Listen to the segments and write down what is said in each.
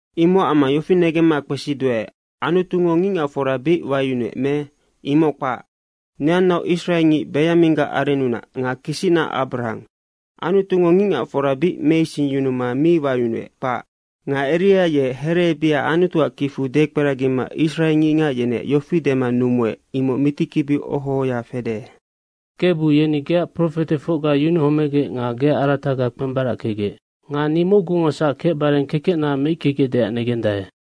Imocac amma yofi negemma kpesiduae, Anutungo ngicngacfora bic wayunuec me? Imoc kpac! Neannaoc Israengic Benyaminggac arennunac nga kisicna Abrahang. Anutungo ngicngacfora bic meisingyunuma mi wayunuec, kpac. Nga Eria ye hereebiha Anutuac kicfu dekperagima israengicngac yeneac yofi dema numuec, imoc mitikibiu oho ohoya fede, “Kebu, yeni geac profetefocga yunuhomegec nga geac arataga kpembarackegec. Nga ni mocgungosac kecbare kekecna meickegecdeac negendae.”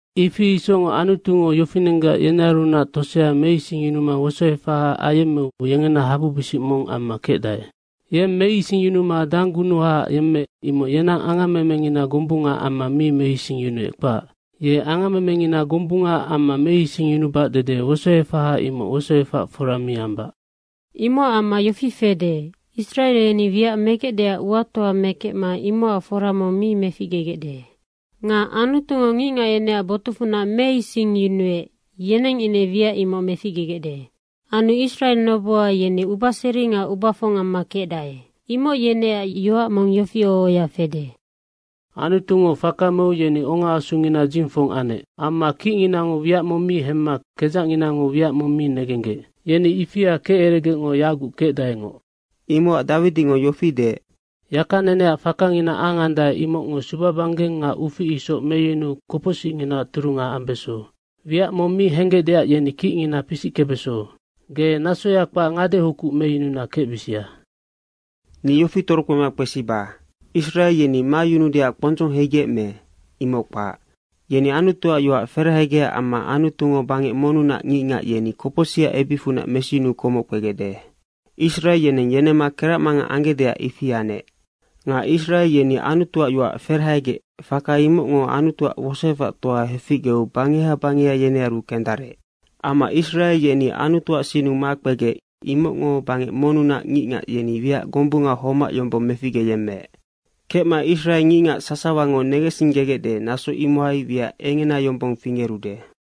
Ifi isocngoc Anutungo yofinenggac yenearunac tosea meisingyunuma wosoefaha ayemmeu yengena habubisic mong amma kecdae. Yeng meisingyunuma danggunuha yemmeec, imoc yenang angammemengina gombungaac amma mi meisingyunuec, kpac. Ye angammemengina gombungaac amma meisingyunubac dede wosoefaha imoc wosoefac fora mi ambac. Imocac amma yofi fede, Israe yeni wiac megecdeac uatoa mekecma imocac fora mong mi meficgegecde. Nga Anutungo ngicngac yeneac botucfunac meisingyunuec, yeneng ine wiac imoc meficgegecde. Anu Israe noboha yeni ubaseri nga ubafong amma kecdae. Imoc yeneac yoac mong yofi oho ohoya fede, “Anutungo faka meu yeni ongaasungina dzingfong anec. Amma kicnginango wiac mong mi hemma kedzacnginango wiac mong mi negenggec. Yeni ifia keceregecngo yaguc kecdaengoc.” Imocac Dawidingo yofi deec, “Yakaneneac fakangina angandae, imocngo subabanggeng nga ufic isoc meyunuu kopocsicnginaac turunga ambeso. Wiac mong mi henggecdeac yeni kicngina pisickebeso. Ge nasoya kpac ngadehokuc meyununa kecbisia.” Ni yofi torokpema kpesiba, Israe yeni mayunuudeac kpondzong heigec me, imoc kpac. Yeni Anutuac yoac ferahegecac amma Anutungo bangec monnunac ngicngac, yeni kopocsicac ebicfunac mesiyunuu komoc kpegecde. Israe yeneng yenemma keracmangang anggecdeac ifi anec. Nga Israe yeni Anutuac yoac ferahegec, faka imocngo Anutuac wosoefactoa heficgeu bangeha bangeha yenearu kendarec. Amma Israe yeni Anutuac sinnu makpegec, imocngo bangec monnunac ngicngac, yeni wiac gombunga homac yombong meficgeyemmeec. Kecma, Israe ngicngac sasawango negensinggegecde, naso imohai wiac engena yombong fingerude.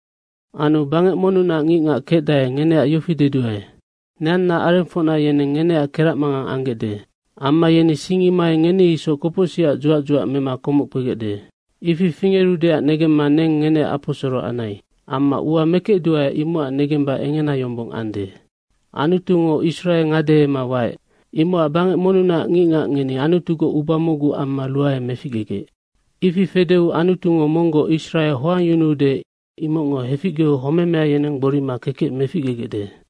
Anu bangec monnunac ngicngac kecdae, ngeneac yofi deduae, neanna arengfocna yeneng ngeneac keracmangang anggecde. Amma yeni sing imohai ngeni isoc kopocsicac dzuac dzuac mema komoc kpegecde. Ifi fingerudeac negemma neng ngeneac aposoro anai. Amma ua mekecduae imocac negemba engena yombong ande. Anutungo Israe ngadehema waec, imocac bangec monnunac ngicngac ngeni Anutugoc uba mocgu amma ruae meficgegec. Ifi fedeu Anutungo monggoc Israe hoangyunuude, imocngo heficgeu homemea yeneng gborima kekec meficgegecde.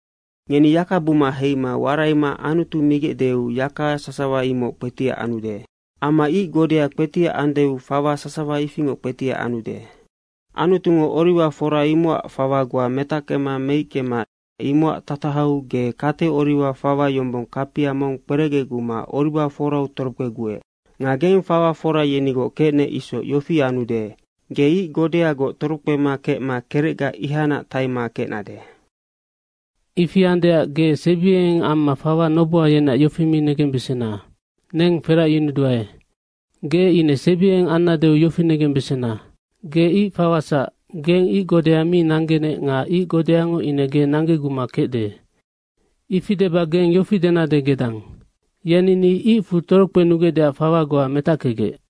Ngeni yaka buma heima waraima Anutu migecdeu yaka sasawa imoc kpetiac anude. Amma ic godea kpetiac andeu fawa sasawa ifingoc kpetiac anude. Anutungo oriwa fora imocac fawa goa metackema meickema, imocac tatahau, ge kate oriwa fawa yombong, kapia mong kperecgeguma oriwa forau torokpeguec. Nga geng fawa fora yenigoc kecnec isoc yofi anude, ge ic godeagoc torokpema kecma kerecga ihacnac taima kecnade. Ifi andeac, ge sebiengeng amma fawa noboha yeneac yofi mi negembesena, “Neng feracyunuduae.” Ge ine sebiengeng annadeu yofi negembesena, ge ic fawasac, geng ic godea mi nanggenec nga ic godeango ine ge nanggeguma kecde. Ifi deba geng yofi denade gedang, “Yeni ninoc icfu torokpenugecdeac fawa goa metackegec.”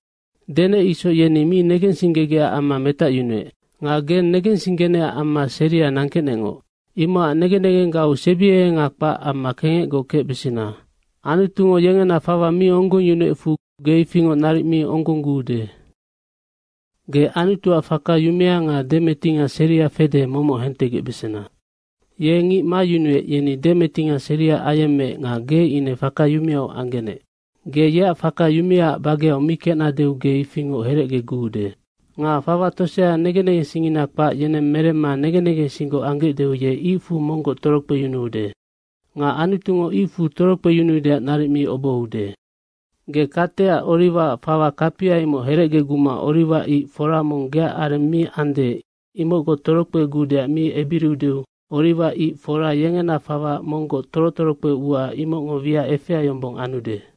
Denec isoc, yeni mi negensinggegecac amma metacyunuec. Nga geng negensinggenecac amma seria nangkecnecngoc. Imocac negen negenggau sebiengenga kpac amma kengecgoc kecbesena. Anutungo yengena fawa mi onggongyunuecfu ge ifingoc naric mi onggongguude. Ge Anutuac faka yumea nga demetinga seria fede, momoc hentegecbesena. Ye ngic mayunuec, yeni demetinga seria ayemmeec nga ge ine faka yumeau anggenec. Ge yeac faka yumeaac bageau mi kecnadeu ge ifingoc herecgeguude. Nga fawa tosea negen negensingngina kpac, yeneng meremma negen negensinggoc anggecdeu ye icfu monggoc torokpeyunuude. Nga Anutungo icfu torokpeyunuudeac naric mi obohoude. Ge kateac oriwaac fawa kapia, imoc herecgeguma oriwa ic fora mong geac areng mi ande, imocgoc torokpeguudeac mi ebiriudeu, oriwa ic fora yengena fawa monggoc toro torokpe ua imocngo wiac efea yombong anude.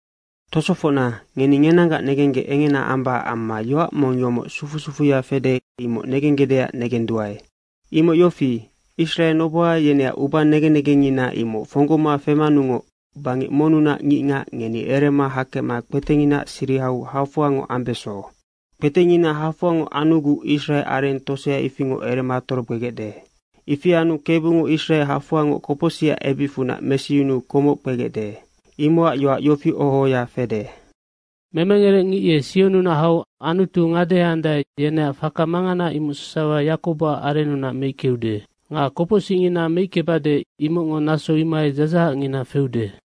Tosofocna, ngeni ngenanggac negenggec engena ambacac amma yoac mong yomoc sufu sufuya fede, imoc negenggecdeac negenduae. Imoc yofi, Israe noboha yeneac uba negen negengngina imoc fonggoma femanungoc bangec monnunac ngicngac, ngeni erema hakecma kpetenginaac sirihau hafoangoc ambeso. Kpetengina hafoangoc anuguc Israe areng tosea ifingoc erema torokpegecde. Ifi anu Kebungo Israe hafoangoc kopocsicac ebicfunac mesiyunuu komoc kpegecde. Imocac yoac yofi oho ohoya fede, “Memengerec ngic ye Sionnunac hau Anutu ngadeheandae, yeneac faka mangana imoc sasawa Yakoboac arennunac meickeude.” “Nga kopocsicngina meickebade, imocngo naso imohai dzadzahacngina feude.”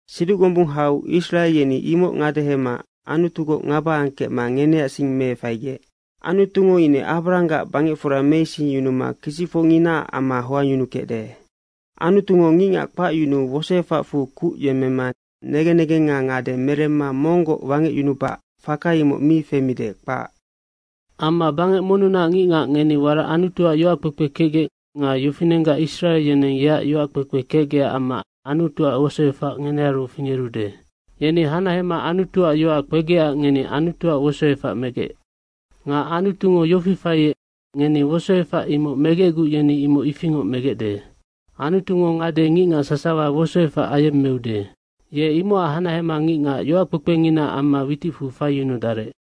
Siduc gombung hau Israe yeni imoc ngadehema Anutugoc ngaba angkecma ngeneac sing meefaigec. Anutungo ine Abrahanggac bangecfora meisingyunuma kisicfocnginaac amma hoangyunukecde. Anutungo ngicngac kpacyunuu wosoefacfu kuc yemmema negen negenga ngade meremma monggoc wangecyunubac, faka imoc mi femide, kpac. Amma bangec monnunac ngicngac, ngeni warac Anutuac yoac kpekpe kecgec nga yofinenggac Israe yeneng yeac yoac kpekpe kecgecac amma Anutuac wosoefac ngenearu fingerude. Yeni hanahema Anutuac yoac kpegecac ngeni Anutuac wosoefac megec. Nga Anutungo yofi faiec, ngeni wosoefac imoc megecguc yeni imoc ifingoc megecde. Anutungo ngade ngicngac sasawa wosoefac ayemmeude. Ye imocac hanahema ngicngac yoackpekpenginaac amma witicfu faiyunudarec.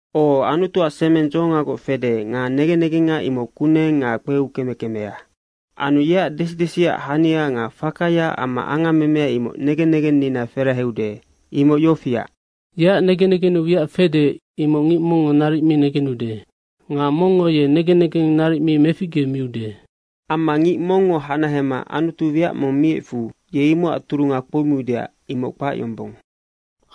O, Anutuac semeng dzohongagoc fede nga negen negenga imoc kuneng nga kpeukeme kemea. Anu yeac desi desiac hania nga fakaya amma angammemea, imoc negen negennina feraheude. Imoc yofiac, yeac negen negennu wiac fede, imoc ngic mongngo naric mi negenude. Nga mongngo ye negen negeng naric mi meficgemiude. Amma ngic mongngo hanahema Anutu wiac mong miecfu ye imocac turunga kpoumiude, imoc kpac yombong.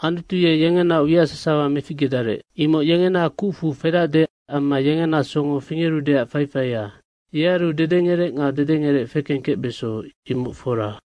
Anutu ye yengenaoc wiac sasawa meficgedarec. Imoc yengena kucfu fedacde amma yengena songo fingerudeac faifaia. Yearu dedengerec nga dedengerec fekengkecbeso, imoc fora.